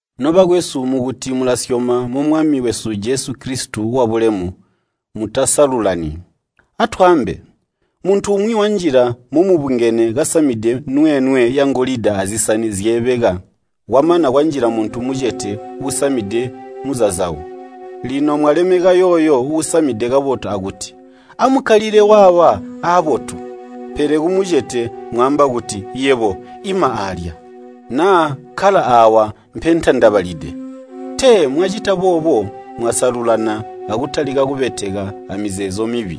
Nobakwesu, mukuti mulasyoma mu Mwami wesu Jesu Kilisito wabulemu, mutasalululani. Atwaambe, muntu umwi wanjila momubungene kasamide nweenwe yangolida azisani zyeebeka, kwamana kwanjila muntu mucete uusamide muzazawu. Lino mwalemeka yooyo uusamide kabotu akuti, “Amukkalile waawa aabotu!” pele kumucete mwaamba kuti, “Yebo, ima aalya,” naa, “Kkala aawa mpentandabalide.” Tee mwacita boobo mwasalululana akutalika kubeteka amizeezo mibi?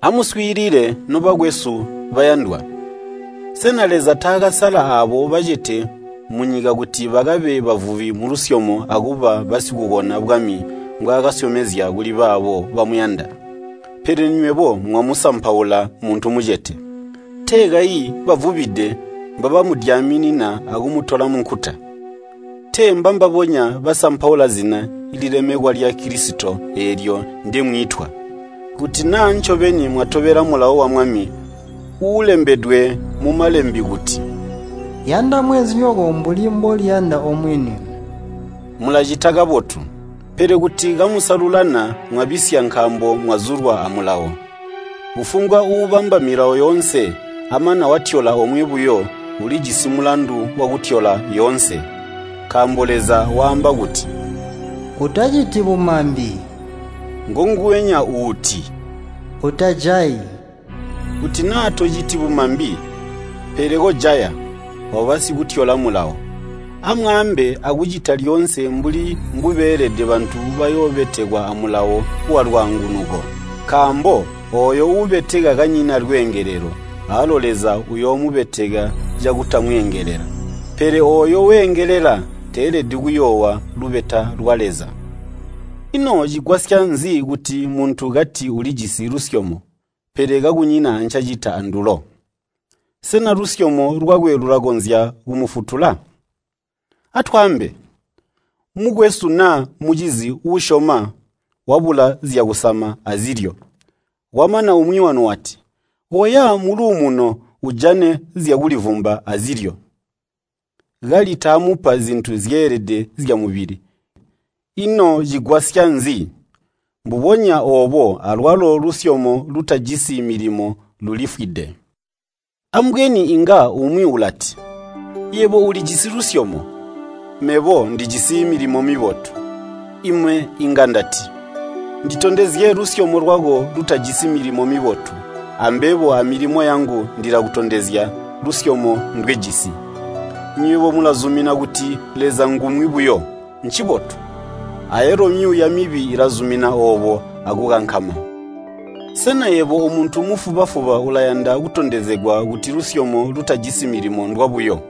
Amuswiilile, nobakwesu bayandwa. Sena Leza taakasala aabo bacete munyika kuti bakabe bavubi mulusyomo akuba basikukona bwami mbwaakasyomezya kuli baabo bamuyanda? Pele nywebo mwamusampaula muntu mucete. Tee kayi bavubide mbabamudyaminina akumutola munkuta? Tee mbambabonya basampaula zina lilemekwa lya Kilisito eelyo ndemwiitwa? Kuti naa ncobeni mwatobela mulawo wa Mwami uulembedwe mu Malembe kuti, “Yanda mweenzinyoko mbuli mboliyanda omwini,” mulacita kabotu. Pele kuti kamusalululana mwabisya nkaambo mwazulwa amulawo. Kufumbwa uubamba milawo yoonse, amana watyola omwe buyo, ulijisi mulandu wakutyola yoonse. Nkaambo Leza waamba kuti, “Utaciti bumambi,” ngonguwenya uuti, “Utajayi.” Kuti naa tociti bumambi, pele kojaya, waba sikutyola mulawo. Amwaambe akucita lyoonse mbuli mbubeelede bantu bayoobetekwa amulawo walwaangunuko. Nkaambo ooyo uubeteka kanyina lweengelelo, awalo Leza uyoomubeteka cakutamweengelela. Pele ooyo weengelela teelede kuyoowa lubeta lwa Leza. Ino cigwasya nzi kuti muntu kati ulijisi lusyomo, pele kakunyina ancacita andulo? Sena lusyomo lwakwe lulakonzya kumufutula? Atwaambe, mukwesu naa mucizi uusyoma wabula zyakusama azilyo, kwamana umwi wanu wati, “Koya muluumuno, ujane zyakulivumba azilyo,” kali taamupa zintu zyeelede zyamubili, ino cigwasya nzi? Mbubonya oobo alwalo lusyomo lutajisi milimo lulifwide. Ambweni inga umwi ulati, “Yebo ulijisi lusyomo, mebo ndijisi milimo mibotu.” Ime inga ndati, “Nditondezye lusyomo lwako lutajisi milimo mibotu, ambebo amilimo yangu ndilakutondezya lusyomo ndwejisi.” Nywebo mulazumina kuti Leza ngumwi buyo, ncibotu. Ayalo myuuya mibi ilazumina oobo akukankama. Sena yebo omuntu mufuba-fuba ulayanda kutondezegwa kuti lusyomo lutajisi milimo ndwabuyo?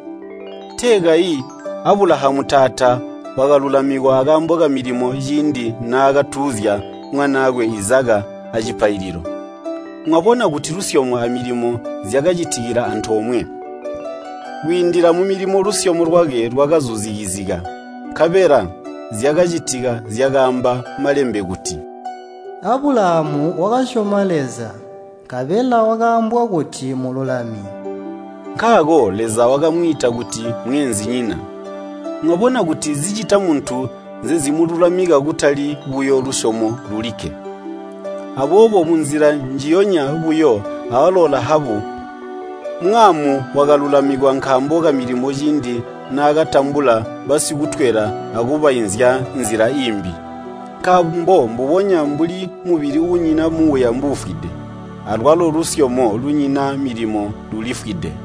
Tee kayi Abulahamu taata wakalulamikwa akaambo kamilimo ciindi naakatuuzya mwanaakwe Izaka acipaililo? Mwabona kuti lusyomo amilimo zyakacitikila antoomwe. Kwiindila mumilimo lusyomo lwakwe lwakazuzikizika. Nkabela zyakacitika zyakaamba Malembe kuti, “Abulahamu wakasyoma Leza, nkabela wakaambwa kuti mululami.” Nkaako Leza wakamwiita kuti mweenzinyina. Mwabona kuti zicita muntu nzezimululamika kutali buyo lusyomo lulikke. Aboobo munzila njiyonya buyo awalo Lahabu mwaamu wakalulamikwa nkaambo kamilimo ciindi naakatambula basikutwela akubainzya nzila iimbi. Nkaambo mbubonya mbuli mubili uunyina muuya mbuufwide, alwalo lusyomo lunyina milimo lulifwide.